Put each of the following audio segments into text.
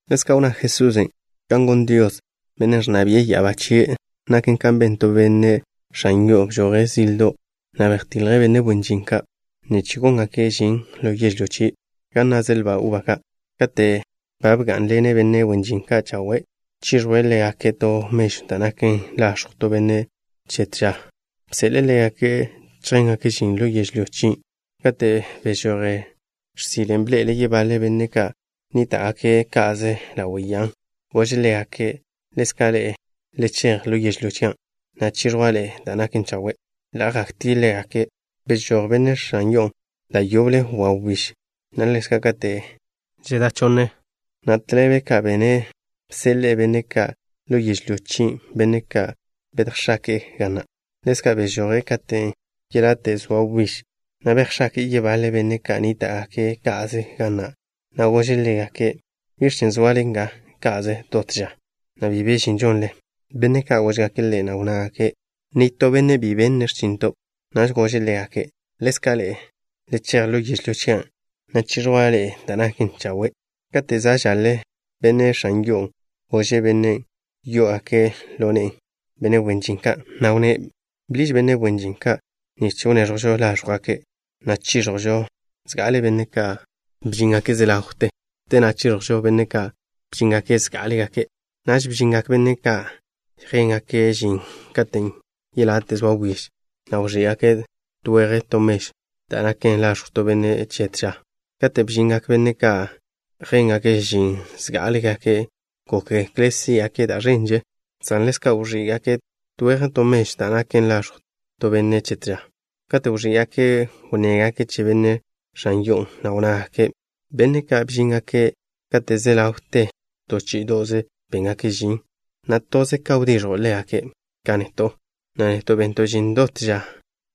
Ḻezka' wnná Jesusen': —Kan gon Dios, Bennen' ẕnna bi'e ya'abá chie', naken ka ben to benne' x̱an yo'o. Bžoje' zildo', na' bejtilje' benne' wen žin ka' nich góngake' žin ḻo yežlyó chie' gan naze' lba uba ka'. Kate' ba bgá'nḻene' benne' wen žin ka' chawe', chiẕjwe' ḻégake' to mežw da' naken laẕjw to benne' che to ža, bseḻe'e ḻégake' chjéngake' žin ḻo yežlyó chien'. Kate' bežoje' x̱sile, bḻe'ele' yebaḻe benne' ka' nníta'gake' ka'ze ḻawe' ya'a. Gože' ḻégake': “Ḻezka' ḻe'e, le chej ḻo yežlyó chian', na' chiẕjwa' ḻe'e da' naken chawe'.” Ḻa' jaktie' ḻégake'. Bežój benne' x̱an yo'on' da' yoble wawbíž, na' ḻezka' kate' žedá chonne, na' tḻebe ka bene', bseḻe'e benne' ka' ḻo yežlyó chien', benne' ka' bejx̱ake'e ga na'. Ḻezka' bežoje' katen' yelate' zoa wbíž, na' bejx̱ake'e yebaḻe benne' ka' nníta'gake' ka'ze ga na', na' gože' ḻégake': “¿Biẕ chen' zoale nga ka'ze dot ža, na' bi be žin žonle?” Benne' ka' góžgake' ḻe', na' wnnágake': “Nitó benne' bi benne' x̱chinto'.” Naž gože' ḻégake': “Ḻezka' ḻe'e, le chej ḻo yežlyó chian', na' chiẕjwa' ḻe'e da' naken chawe'.” Kate' za' žaḻe, benne' x̱an yo'on' gože' bennen' yo'ogak ḻo ne'e benne' wen žin ka', na' wnné': “Bḻiž benne' wen žin ka' nich wneẕjo' láẕjwgake', na' chiẕjo' zga'ale benne' ka' bžíngake' ze ḻawte. Te na' chiẕjo' benne' ka' bžíngake' zgá'alegake'.” Naž bžingak benne' ka' yjéngake' žin katen' yelate' zoa wbíž, na' wẕí'gake' to weje' to mežw da' naken laẕjw to benne' che to ža. Kate' bžingak benne' ka' yjéngake' žin zgá'alegake', gókgekle' sí'gake' da' ẕenže, san ḻezka' wẕí'gake' to weje' to mežw da' naken laẕjw to benne' che to ža. Kate' wẕí'gaken', wnnégake' che benne' x̱an yo'on', na' wnnágake': “Benne' ka' bžíngake' kate' ze ḻawte, to chí'ido'ze béngake' žin, na' toze ka wdiẕjo' ḻégake' ka neto', na' neto' bento' žin dot ža,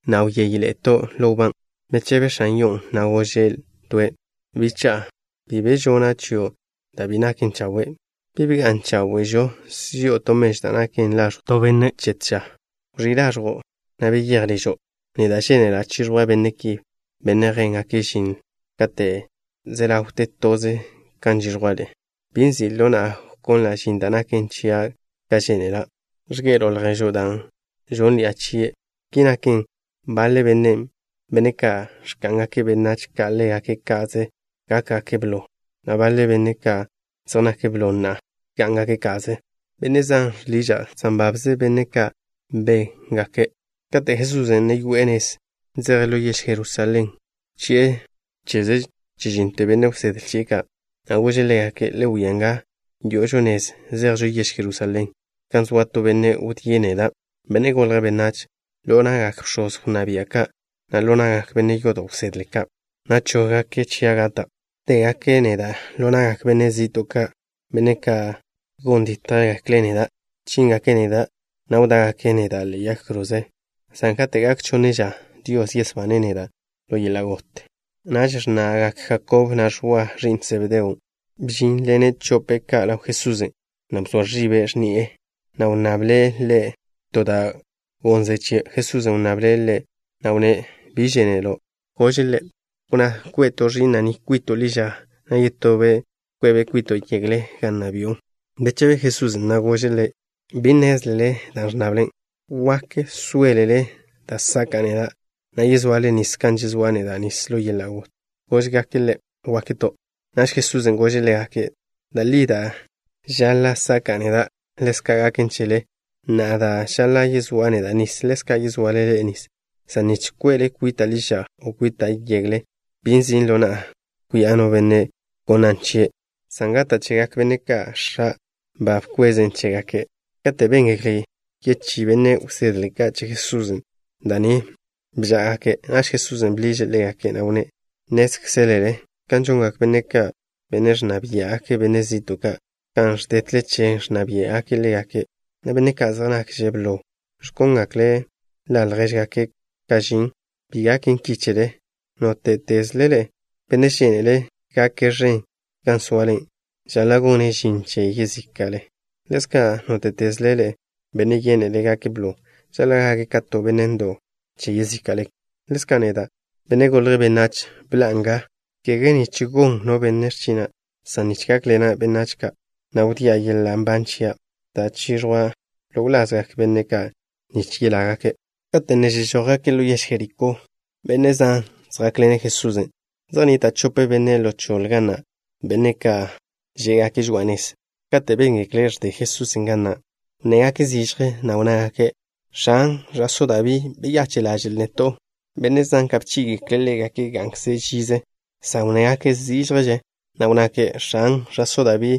na' wyéyeḻe'eto' ḻo wbá.” Bechebe x̱an yo'on', na' gože' toe': “Bicha'a, bi be žona' chio' da' bi naken chawe'. ¿Bi bga'n cháwe'žo si'o to mežw da' naken laẕjw to benne' che to ža? Wẕí' laẕjo', na' beyéj ližo'. Neda' žénela' chiẕjwa' benne' ki, benne' yjéngake' žin kate' ze ḻawte toze kan žiẕjwa' le'. ¿Bi nzi' ḻo na'a wconla' žin da' naken chia' ka žénela'? ¿Ẕge'elo' lježo' dan' žónnḻi'a chie'?” Ki naken, baḻe benne', benne' ka' ẕka'ngak benách ka' ḻégake' ka'ze, gákgake' blo, na' baḻe benne', benne' ka' zej nake' blo na'a, gá'ngake' ka'ze. Benne' zan žḻiža' san babze benne' ka' nbégake'. Kate' Jesusen' ne yoe'e nez, zeje' ḻo yež Jerusalén, bchi'e cheze chežínnote benne' wsedle chie' ka', na' gože' ḻégake': —Le wia nga, yo'ožo nez zejžo yež Jerusalén, gan soa to benne' wdíe' neda', Benne' Golje' Benách, ḻo na'gak bx̱oz wnná bia' ka', na' ḻo na'gak benne' yodo' wsedle ka', na' chóggake' chia' gata'. Wdégake' neda' ḻo na'gak benne' zi'to' ka', benne' ka' gon dítjgekle' neda'. Chíngake' neda', na' wdá'gake' neda' ḻe'e yag kroze, san kate' gak chonne ža, Dios yesbane' neda' ḻo yeḻa' got. Naž x̱na'gak Jakob, na' Ẕwa, ẕi'n Sebedeo ka', bžínḻene' chope' ka' ḻaw Jesusen', na' bzoa ẕibe' x̱ni'e Ḻe', na' wnnable' Ḻe' to da' gonze' chie'. Jesusen' wnnable' ḻe', na' wnné': —¿Biẕ žénelo'? Gože' Ḻe': —Wnná kwe' to ẕi'na' ni kwito' ḻi ža, na' yetobe' kwe'be' kwito' yegle gan nna bi'o. Bechebe Jesusen', na' gože' ḻégake': —Bi nnézlele da' ẕnnable. ¿Wak sóelele da' saka'a neda', na' yezoale nis kan yezóa' neda' nis ḻo yeḻa' got? Góžgake' Ḻe': —Gakto'. Naž Jesusen' gože' ḻégake': —Da' li da' žaḻa' saka'a neda', ḻezka' gaken chele, na' da' žaḻa' yezóa' neda' nis, ḻezka' yezoale ḻe'e nis, san nich kwe'le kwita' ḻi ža, o kwita' yegle, bi nzi' ḻo na'a kwia' no benne' gonnan' chie', san gata' chegak benne' ka' X̱a' ba bkwezen' chégake'. Kate' béngekle yechí benne' wsedle ka' che Jesusen' da' ni, bžá'agake'. Naž Jesusen' bḻiže' ḻégake', na' wnné': —Nnézkzelele kan žongak benne' ka', benne' ẕnna biá'gake' benne' zi'to' ka', kan ẕdétleche ẕnna biá'gake' ḻégake', na' benne' ka' zej nakže' blo ẕkóngekle' ḻa' ljéžgakkze' ka' žin. Bi gaken ki chele. Nóte'tezle ḻe'e, benne' žénele' gake' ẕen gan zoale, žaḻa' gone' žin che yezíka'le. Ḻezka', nóte'tezle ḻe'e, benne' yénele' gake' blo, žaḻa' gake' ka to benne' ndo'w che yezíka'le. Ḻezka' neda', Benne' Golje' Benách, bḻa'a nga, kege nich gon no benne' x̱china', san nich gákḻena' benách ka', na' wdía' yeḻa' nban chia', da' chiẕjwa' ḻo wlazgak benne' zan nich yelágake'. Kate' ne zežójgake' ḻo yež Jerikó, benne' zan zjákḻene' Jesusen'. Zej nnita' chope benne' ḻo choḻe ga na', benne' ka' žé'gake' žoa'a nez. Kate' béngekle' ẕde Jesusen' ga na', wnnégake' zižje, na' wnnágake': —X̱an, ẕa'só Dabí, beyache' ḻaže'l neto'. Benne' zan ka' bchí'igekle' ḻégake' gá'ngake' žize, san wnnégake' zížježe, na' wnnágake': —X̱an, ẕa'só Dabí,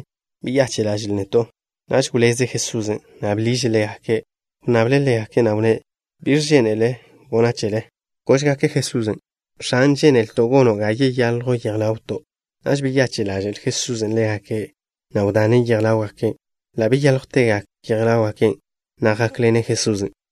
beyache' ḻaže'l neto'. Naž wléz Jesusen', na' bḻiže' ḻégake'. Wnnable' ḻégake', na' wnné': —¿Biẕ žénelele gona' chele? Góžgake' Jesusen': —X̱an, žénelto' gono' ga yeyaljw yej ḻawto'. Naž beyache' ḻaže'l Jesusen' ḻégake', na' wdane' yej ḻáwgake'. Ḻa' beyáljwtegak yej ḻáwgake', na' jákḻene' Jesusen'.